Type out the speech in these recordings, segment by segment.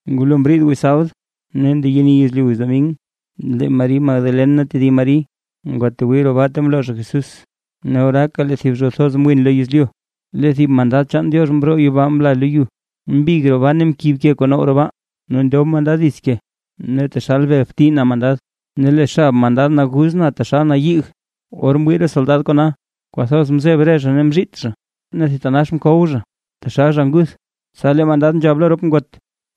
Ngulo mriid wiz sabd, ne ndeyeni yezlyu wiz domin, lee Mari Magdalen ne lee tedib Mari ngwatwii roo baa ta mloo zha Jesús. Ne oraaka lee thib zho thoz mwin lo yezlyu. Lee thib mandad chaan Diox mroo yibaa mla lo yu, mbig roo baa ne mkib ke kuu now roo baa ne mndob mandad dits ke. Ne taxal bel bti na mandad, ne lee xab mandad naguz na taxal na yig. Or mwii re soldad kona, kwathoz mzeb re zha ne mzhiit zha, ne thitanax mkow zha, taxal zha nguth. Tsa lee mandad nzhab lo rop ngot: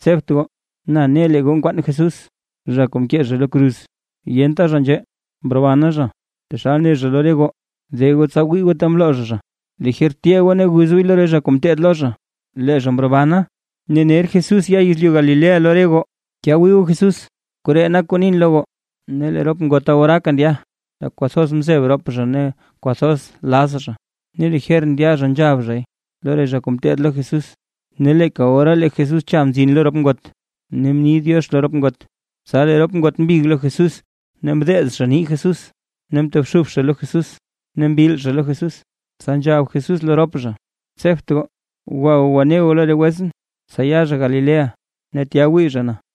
―Tsebt goo. Na ne lee goo nkwaan Jesús, zha kuu mkee zha lo kruz. Yenta zha nzhee, mrobana zha, taxal ne zha lo re goo. De goo tsa wii goo ta mloo zha zha. Lijer tyee goo ne guz gooy lo re zha kuu mteed lo zha, lee zha mrobana. Ne ner Jesús ya yezlyu Galilea lo re goo. Tya wii goo Jesús. Koree nak kuu nin lo goo. Ne lee rop ngota oraaka ndya, tak kwathoz mzeb rop zha ne kwathoz laz zha. Ne lijer ndya zha nzhab zhay lo re zha kuu mteed lo Jesús. Ne leeka ora lee Jesús cha mzin lo rop ngot, ne mni “diox” lo rop ngot. Tsa lee rop ngot mbig lo Jesús, ne mdeez zha nii Jesús, ne mtobxub zha lo Jesús ne mbil zha lo Jesús. Tsa nzhab Jesús lo rop zha: ―Tsebt goo. Gwa goo gwane goo lo re wetsʼn tsa ya zha Galilea, ne tya wii zha na.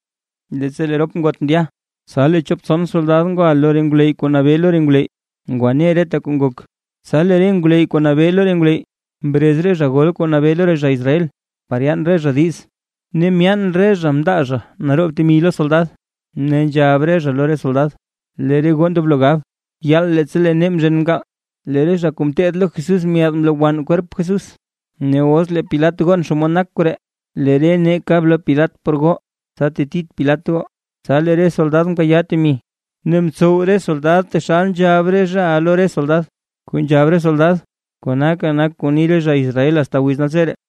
Leettsa lee rop ngot ndya, tsa lee chop tson re soldad ngwa lo re ngwleyy kuu nabee lo re ngwleyy ngwane reta kuu ngok. Tsa lee re ngwleyy kuu nabee lo re ngwleyy mrez re zha gol kuu nabee lo re zha Israel, par yaan re zha diiz. Ne myaan re zha mndaa zha naroob temi lo re soldad, ne nzhab re zha lo re soldad: ―Lee re goo ndoblo gab: “Yaal, leettsa lee nee mzhen mkaal, lee re zha kuu mteed lo Jesús myaad mlowann kwerp Jesús”. Ne os lee Pilat gon xomod nak koree, lee re nee kab lo Pilat por goo, tsa tetit Pilat goo. Tsa lee re soldad mkayaa temi, ne mtsow re soldad taxal nzhab re zhaʼa lo re soldad. Kuu nzhab re soldad konaka nak kuu ni re zha Israel asta wiz naltseree.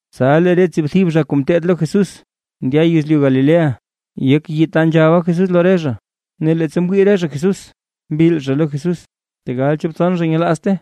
Tsa lee re tsiibthib zha kuu mteed lo Jesús, ndya yezlyu Galilea, yek yii ta nzhaba Jesús lo re zha. Ne leettsa mwii re zha Jesús mbil zha lo Jesús, tegal nzo chop tson zha nyelaazte.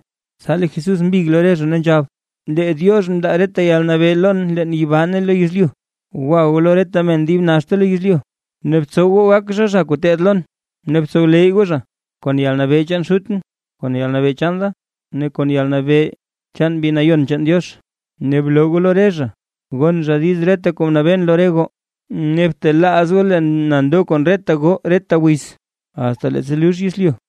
Tsa lee Jesús mbig lo re zha ne nzhab: ―Lee Diox mndaa reta yalnabee lon leen yibaa ne lo yezlyu. Gwa goo lo reta men dib naxta lo yezlyu, ne btsow goo gak zha, zha kuu teed lon, ne btsowleyy goo zha, kon yalnabee chaan Xutʼn, kon yalnabee chaan da, ne kon yalnabee chaan Mbi Nayon chaan Diox. Ne bloo goo lo re zha gon zha diiz reta kuu mnabeen lo re goo. Ne btelaaz goo le na ndo kon reta goo reta wiz, asta leettsa lux yezlyu.